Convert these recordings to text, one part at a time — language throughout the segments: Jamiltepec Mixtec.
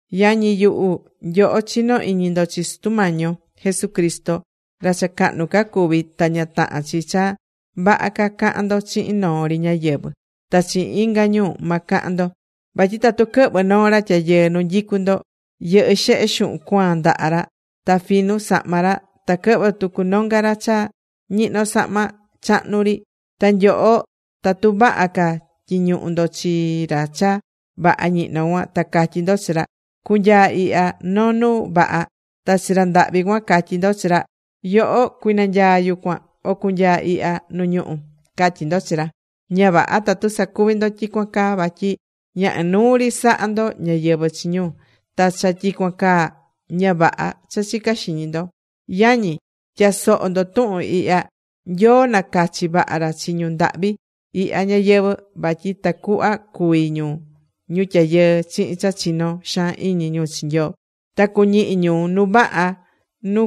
Yañi yuhu, nyoho chinó iñi ndo chi Sutu Mañi yo Jesucristo ra cha cahnu ca cuví, ta ña tahán chi cha vaha ca cahán ndo chihin noo ri ñáyɨvɨ, ta chihin inga ñu ma cahan ndo. Vatyi tatu quɨhvɨ̱ noo ra tyayɨɨ nu nyicu ndo, yɨhɨ́ xehe xuhun cuaan ndaha ra, ta finu sahma ra, ta quɨhvɨ̱ tucu nonga ra cha ñihnó sahma chahnu ri. Ta nyoho tatu vaha ca tyiñuhu ndo chi ra cha vaha ñihno cuan, ta catyí ndo chi ra: “Cu̱nyaa ihya noo nu vaha.” Ta chi ra ndahvi cuan catyí ndo chi ra: “Yoho cui̱nanyaa yucuan o cu̱nyaa ihya nu ñuhú”, catyí ndo chi ra. Ña vaha tatu sacuví ndo tyicuan caa, vatyi ña inuu ri sahá ndo ñáyɨvɨ chi ñu, ta cha tyicuan caa, ña vaha cha chicá xiñi ndo. Yañi, tya̱soho ndo tuhun ihya. Nyoo nacachi̱ vaha ra chi ñu ndahvi ihya ñayɨvɨ̱, vatyi ta cuhva cuví ñu ñu tyayɨɨ chihin cha chinó xaan iñi ñu chi Nyoo, ta cuñihi ñu nu vaha nu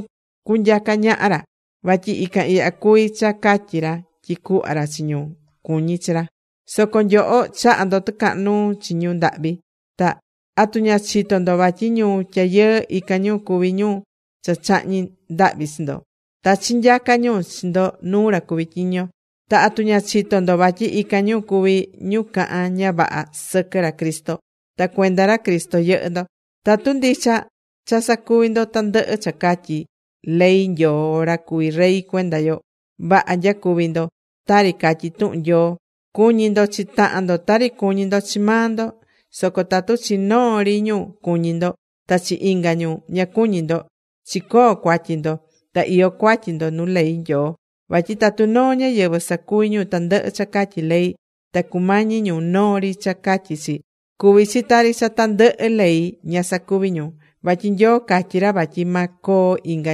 nyacá ñaha ra. Vatyi ican ihya cuví cha catyi ra tyi cuhva ra chi ñu cuñí chi ra. Soco nyoho chahá ndo tɨcahan nuu chi ñu ndahvi. Ta ¿atu ña chitó ndo vatyi ñu tyayɨɨ, ican ñu cuví ñu cha chahñí ndahvi chi ndo? Ta chinyacá ñu chi ndo nuu ra cuví tyiño. Ta ¿atu ña chitó ndo vatyi ican ñu cuví ñu cahán ña vaha sɨquɨ ra Cristo? Ta cuenda ra Cristo yɨhɨ́ ndo. Tatu ndicha cha sacuví ndo tandɨhɨ cha catyí ley Nyoo ra cuví rey cuenda yo, vaha nyacuví ndo. Tari catyí tuhun Nyoo: “Cu̱ñi ndo chi tahan ndo tari cuñí ndo chi maa ndo.” Soco tatu chi noo ri ñu cuñí ndo. Ta chi inga ñu ña cuñí ndo, chicoó cuatyi ndo. Ta iyó cuatyi ndo nu ley Nyoo. Vatyi tatu noo ñáyɨvɨ sacuví ñu tandɨhɨ cha catyí ley, ta cumañí ñu noo ri cha catyí chi, cuví chi tari cha tandɨhɨ ley ña sacuví ñu. Vatyi Nyoo catyi̱ ra vatyi ma coo inga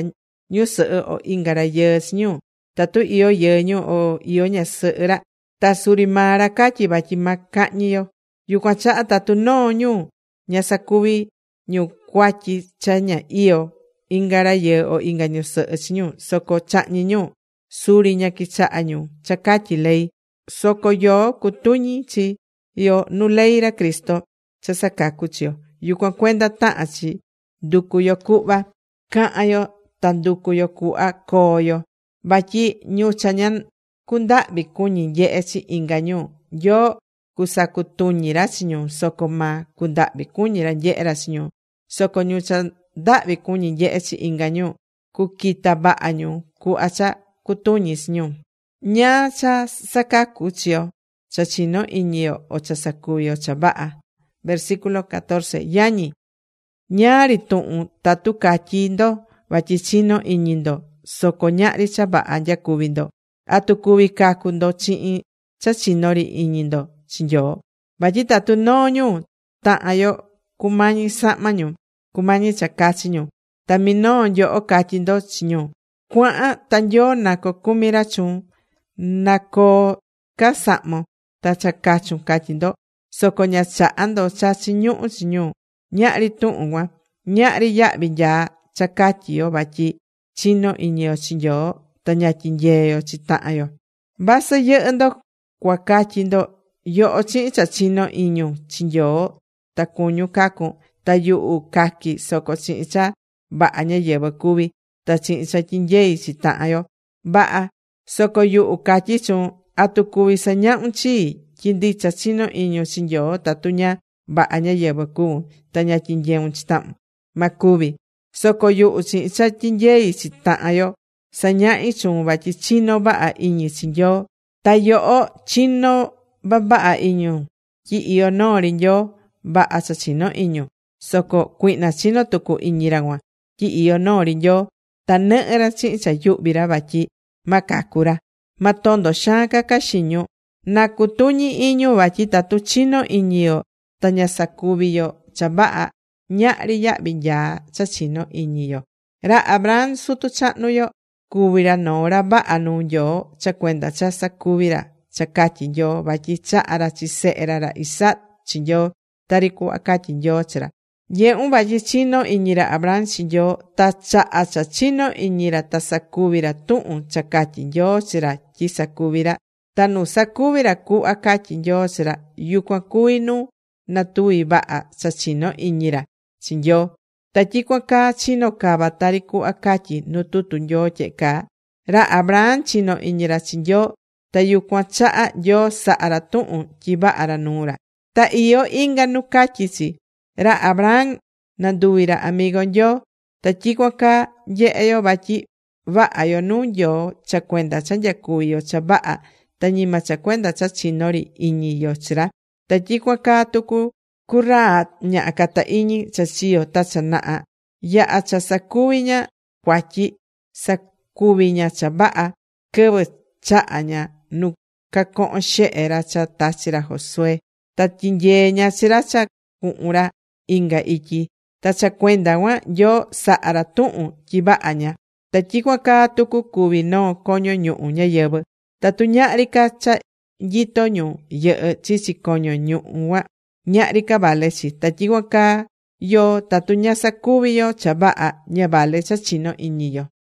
ñusɨhɨ o inga rayɨɨ chi ñu, tatu iyó yɨɨ ñu o iyó ñasɨhɨ ra. Ta suri maa ra catyi̱ vatyi ma cahñi yo. Yucuan chaha tatu noo ñu ña sacuvi ñu cuatyi cha ña iyó inga rayɨɨ o inga ñusɨhɨ chi ñu soco chahñí ñu, suri ña quichahá ñu cha catyí ley. Soco yoó cucutuñi chi yo nu ley ra Cristo cha sacacú chi yo. Yucuan cuenda tahan chi nducu yo cuhva cahan yo ta nducu yo cuhva coo yo. Vatyi ñu cha ña cundahvi cuñí nyehe chi inga ñu, Nyoo cusacutuñi ra chi ñu, soco ma cundahvi cuñí ra nyehé ra chi ñu. Soco ñu cha ndahvi cuñí nyehé chi inga ñu, cuquita vaha ñu cuhva cha cutuñi chi ñu. ¿Ñáá cha sacacú chi yo, cha chinó iñi yo o cha sacuví yo cha vaha? Yañi, ñáá ri tuhun tatu catyí ndo vatyi chinó iñi ndo, soco ñahri cha vaha nyacuví ndo. ¿Atu cuví cacu ndo chihin cha chino iñi ri ndo chi Nyoo? Vatyi tatu noo ñu tahan yo cumañí sahma ñu, cumañí cha cachi ñu, ta minoo nyoho catyí ndo chi ñu: “Cua̱han ta Nyoo na cocumi ra chuun. Na coo ca sahmon ta cha cachun”, catyi ndo. Soco ña chahá ndo cha chiñuhú chi ñu. ¿Ñáá ri tuhun cuan? Ñahri yahvi nyaa cha catyí yo vatyi chinó iñi yo chi Nyoo, ta ña tyinyeé yo chi tahan yo. Vasɨ yɨhɨ́ ndo cua catyi ndo: “Yoho chihin cha chinó iñun chi Nyoo ta cuñun cacun, ta yuhu caqui soco chihin cha vaha ñáyɨvɨ cuví ta chihin cha tyinyeí chi tahan yo.” Vaha. Soco yuhu catyí chuun, ¿atu cuví sañahun chii tyi ndicha chinó iñun chi Nyoo tatu ña vaha ñáyɨvɨ cuvún ta ña tyinyeún chi tahun? Ma cuvi. Soco yuhu chihin cha tyinyeí chi tahan yo sañahí chuun vatyi chinó vaha iñi chi Nyoo. Ta yoho chinó vavaha iñun tyi iyó noo ri Nyoo. Vaha cha chinó iñun. Soco cuihna chinó tucu iñi ra cuan tyi iyó noo ri Nyoo. Ta nɨhɨ́ ra chihin cha yuhví ra vatyi ma cacu ra. Ma tondo xaan caca xiñun. Na cutuñi iñun vatyi tatu chinó iñi yo ta ña sacuví yo cha vaha, ñahri yahvi nyaa cha chinó iñi yo. Ra Abraham sutu chahnu yo, cuvi̱ ra noo ra vaha nuu Nyoo cha cuenda cha sacuvi̱ ra cha catyi̱ Nyoo. Vatyi chaha̱ ra chi sehe ra, ra Isaac chi Nyoo tari cuhva catyi̱ Nyoo chi ra. Nyehún vatyi chinó iñi ra Abraham chi Nyoo ta chaha cha chinó iñi ra ta sacuvi̱ ra tuhun cha catyi̱ Nyoo chi ra tyi sacuvi ra. Ta nu sacuvi̱ ra cuhva catyi̱ Nyoo chi ra, yucuan cuvi̱ nu natuvi vaha cha chinó iñi ra chi Nyoo. Ta tyicuan caa chino̱ cava tari cuhva catyí nu tutu Nyoo tyehe caa: “Ra Abraham chino̱ iñi ra chi Nyoo ta yucuan chaha Nyoo saha̱ ra tuhun tyi vaha ra nuu ra.” Ta iyó inga nu catyí chi: “Ra Abraham, nanduvi̱ ra amigo Nyoo.” Ta tyicuan caa nyehe yo vatyi vaha yo nuu Nyoo cha cuenda cha nyacuvi yo cha vaha, ta ñima cha cuenda cha chinó ri iñi yo chi ra. Ta tyicuan caa tucu cu Rahab ñaha cata iñi cha chiyo̱ ta cha naha. Yaha̱ cha sacuvi̱ ña cuatyi, sacuvi̱ ña cha vaha quɨvɨ chaha̱ ña nu cacohon xehe ra cha tachi̱ ra Josué. Ta tyinyee̱ ña chi ra cha cuhun ra inga ityi. Ta cha cuenda cuan Nyoo saha̱ ra tuhun tyi vaha ña. Ta tyicuan caa tucu cuví noo coño ñuhu ñáyɨvɨ. Tatu ñahri ca cha nyitó ñu yɨhɨ́ chichi coño ñuhu cuan, ñahri ca vale chi. Ta tyicuan caa yoó, tatu ña sacuví yo cha vaha, ña vale cha chinó iñi yo.